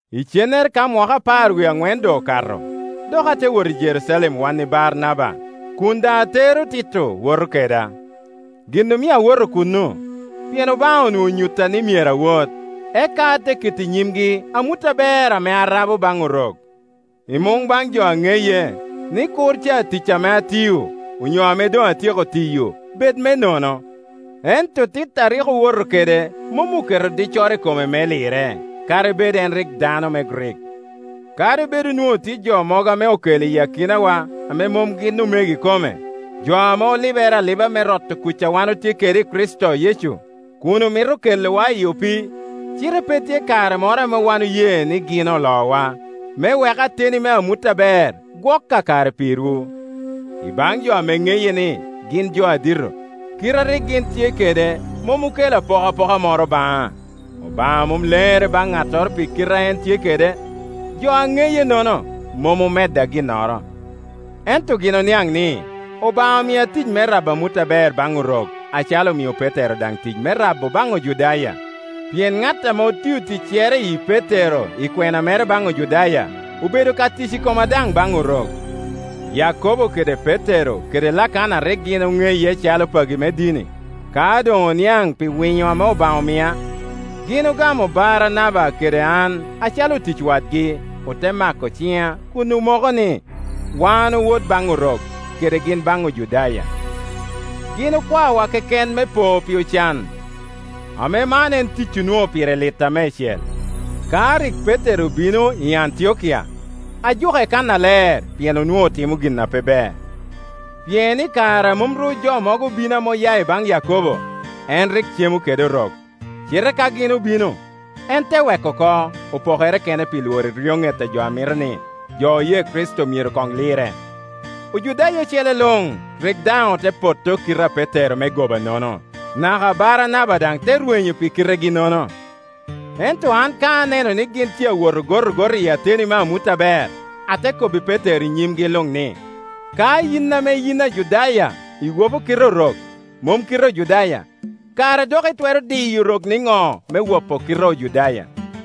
Icennere ka mwaka apar wie aŋwen doŋ okato, dok ate wot i Jerucalem wan i Baranaba, kun daŋ atero Tito woto keda. Gin omio awoto kuno, pien Obaŋa onwoŋo onyutta ni myero awot; eka ate keto i nyimgi amut aber ame arabo baŋ Orok, i muŋ baŋ jo a ŋeye, ni kur ca ticca ame atiyo, onyo ame doŋ atyeko tiyo, bed me nono. Ento Tito a rik owoto kede mom oketo diccoro i kome me lirre, kadi bed en rik dano me Grik. Kadi bed onwoŋo tye jo mogo ame okelo iyi akinawa ame mom gin omego ikome, jo ame olibere aliba me roto kuc a wan otye kede i Kricito Yecu, kun omito kelowa i opii, cite pe tye kare moro ame wan oye gin olowa, me wek ateni me amut aber gwok kakare pirwu. I baŋ jo ame ŋeye ni gin jo adito (kite a rik gin tye kede mom okelo apokapoka moro baŋa; Obaŋa mom lenere baŋ ŋattoro pi kite a en tye kede) jo a neye-nono mom omedda ginnoro. Ento gin oniaŋ ni, Obaŋa omia tic me rabo amut aber baŋ Orok, acalo omio Petero Petero: Leb Grik: Kepa daŋ tic me rabo baŋ Ojudaya; pien ŋat ame otio ticcere i Petero i kwena mere baŋ Ojudaya, obedo ka tic i koma daŋ baŋ Orok. Yakobo kede Petero kede Lakana a rik gin oŋeye acalo pagi me dini, ka doŋ oniaŋ pi winyo ame Obaŋa omia, gin ogamo Baranaba kede an acalo otic wadgi. Ote mako ciŋa kun omoko ni, wan owot baŋ Orok, kede gin baŋ Ojudaya. Gin okwaowa keken me po pi ocan, ame man en tic onwoŋo pire litta meicel Ka rik Petero obino i Antiokia ajuke kannaler, pien onwoŋo timo gin a pe ber. Pien i kare a mom ru jo mogo obino ame oya i baŋ Yakobo, en rik cemo kede Orok; cite ka gin obino, en te weko oko, opokere kene pi lworo eryoŋet a jo a mito ni, jo oye Kricito myero koŋ lirre. Ojudaya ocele luŋ rik daŋ ote potto kite a Petero me gobaŋono: naka Baranaba daŋ te rwenyo pi kiregi-nono. Ento an ka aneno ni gin tye awot ogotogot iyi ateni me amut aber, ate kobbi Petero i nyimgi luŋ ni, “Ka yin ame yin Ajudaya iwopo kite Orok, mom kite Ojudaya, kara dok itwero diyo Orok niŋo me wopo kite Ojudaya?”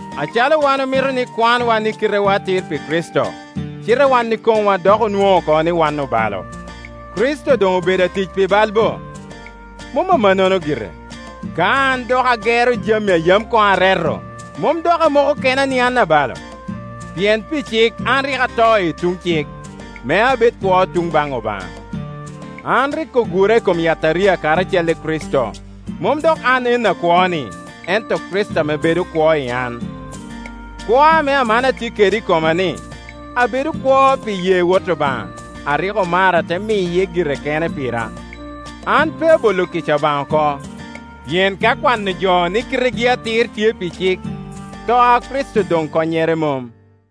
Acalo wan omito ni kwanwa ni kitewa atir pi Kricito, cite wan ikomwa dok onwoŋo oko ni wan obalo, Kricito doŋ obedo atic pi bal bo? Mom amanno gire! Ka an dok agero jami a yam koŋ areto, mom dok amoko kena ni an abalo? Pien pi cik an rik ato i tuŋ cik, me abed kwo i tuŋ baŋ Obaŋa. An rik ogura i kom yataria karacel i Kricito; mom dok an en akwo-ni, ento Kricito ame bedo kwo i an. Kwo ame aman atye kede i koma-ni, abedo kwo pi ye Wot Obaŋa, a rik omara te miye gire kene pira. An pe abolo kica Obaŋa oko; pien ka kwano jo ni kitegi atir tye pi cik, to a Kricito doŋ konnyere mom,